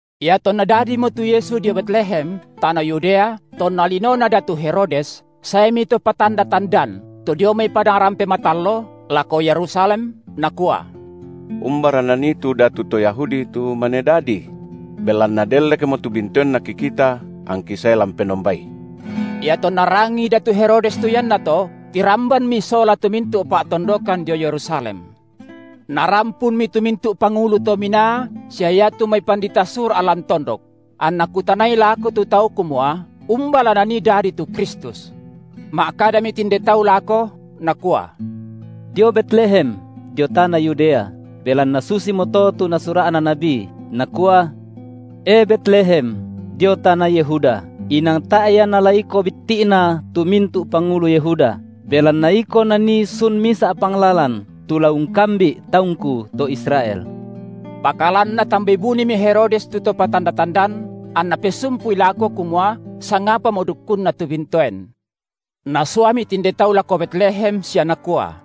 Iatonna dadimo tu Yesu dio Betlehem, tana Yudea, tonna linona datu Herodes, saemi to patanda-tandan, to dio mai padang rampe matallo, lako Yerusalem, nakua: Umbara nanii tu datu to Yahudi, tu mane dadi? Belanna dellekmo tu bintoenNa kikita, angki sae la umpenombai. Iatonna rangii datu Herodes tu iannato, tirambanmi sola tu mintu’ pa’tondokan dio Yerusalem. Narampunmi tu mintu’ pangulu to minaa sia iatu mai pandita Sura’ lan tondok, anna kutanai lako tu tau kumua, umba la nanii dadi tu Kristus. Ma’kadami tinde tau lako, nakua: Dio Betlehem, dio tana Yudea, belanna susimoto tu nasura’na nabi, nakua: E Betlehem, dio tana Yehuda, inang tae’ ia nala iko bitti’na tu mintu’ pangulu Yehuda, belanna iko nanii sun misa’ panglalan, tu la ungkambi’ taungKu to Israel. Pakalan natambai bunimi Herodes tu to patanda-tandan, anna pesumpui lako kumua sangapamo dukkunna tu bintoen. Nasuami tinde tau lako Betlehem sia nakua: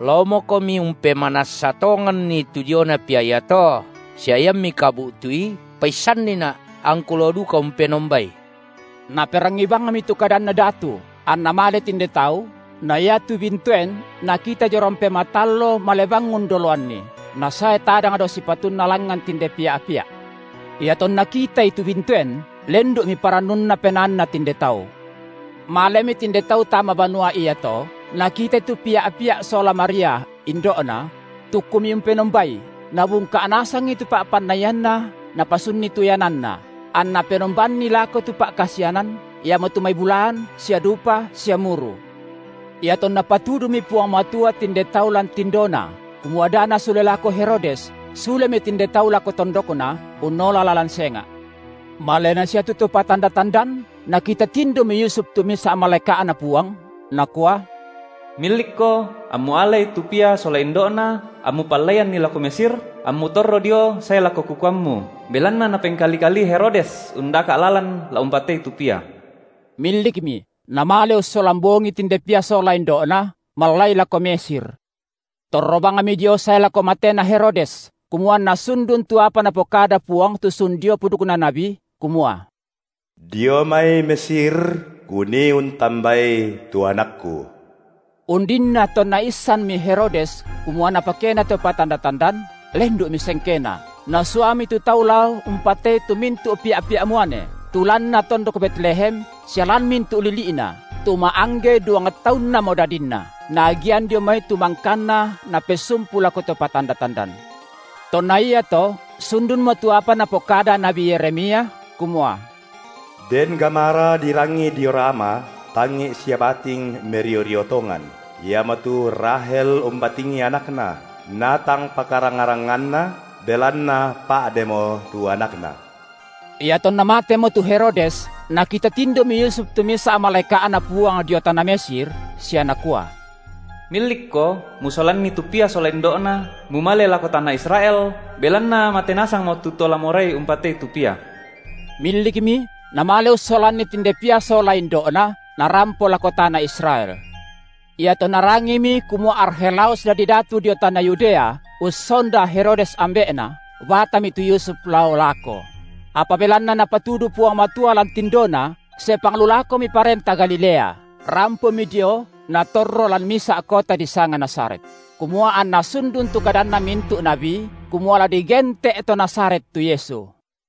Laomokomi umpemanassa tonganni tu diona Pia iato, sia iammi kabu’tui, paissannina’, angku lao duka umpenombai. Naperangii bangmi tu kadanna datu, anna male tinde tau, na iatu bintoen nakita dio rampe matallo male bang undoloanni, nasae tadang dao sipatunna langngan tinde’ Pia’-pia’. Iatonna kitai tu bintoen lendu’mi parannunna penaanna tinde tau. Malemi tinde tau tama banua iato, nakitai tu Pia’-pia’ sola Maria, indo’Na; tukkumi umpenombaI, nabungka’ nasangi tu pa’pannianna napasunni tu iananna, anna penombanni lako tu pa’kasianan, iamotu mai bulaan sia dupa sia muru. Iatonna patudumi Puang Matua tinde tau lan tindona kumua da nasule lako Herodes, sulemi tinde tau lako tondokna unnola lalan senga’. Malena sia tu to patanda-tandan, nakita tindomi Yusuf tu misa’ malaeka’Na Puang, nakua: Millikko, ammu alai tu Pia sola indo’Na, ammu pallaianni lako Mesir, ammu torro dio sae lako kukuammu, belanna napengkali-kalii Herodes undaka’ lalan la umpatei tu Pia. Millikmi, namale ussolan bongii tinde Pia sola indo’Na, mallai lako Mesir. Torro bangmi dio sae lako matena Herodes, kumua anna sundun tu apa Napokada Puang tu sun dio pudukna nabi, kumua: Dio mai Mesir Kunii untambai tu AnakKu. Undinna tonna issanmi Herodes kumua napakena to patanda-tandan, lendu’mi sengkena, nasuami tu tau lao umpatei tu mintu’ pia’-pia’ muane, tu lanna tondok Betlehem sia lan mintu’ lili’na, tu ma’angge duang taunnamo dadinna, naagian dio mai tu mangkanna napesumpu lako to patanda-tandan. Tonna iato sundunmo tu apa napokada nabi Yeremia, kumua: Den gamara dirangi dio Rama, tangi’ sia bating merio-rio tongan; iamotu Rahel umbatingi anakna, natang pakaranga-ranganna, belanna pa’demo tu anakna. Iatonna matemo tu Herodes, nakita tindomi Yusuf tu misa’ malaeka’Na Puang dio tana Mesir, sia nakua: Millikko musolanni tu Pia sola indo’Na, mumale lako tana Israel, belanna mate nasangmo tu to la morai umpatei tu Pia. Millikmi, namale ussolanni tinde Pia sola indo’Na, narampo lako tana Israel. Iatonna rangimi kumua Arkhelaus dadi datu dio tana Yudea ussonda Herodes ambe’na, batami tu Yusuf lao lako; apa belanna Napatudu Puang Matua lan tindona, sepang lu lakomi parenta Galilea, rampomi dio natorro lan misa’ kota disanga Nazaret, kumua anna sundun tu kadanna mintu’ nabi, kumua la digente’ To Nazaret tu Yesu.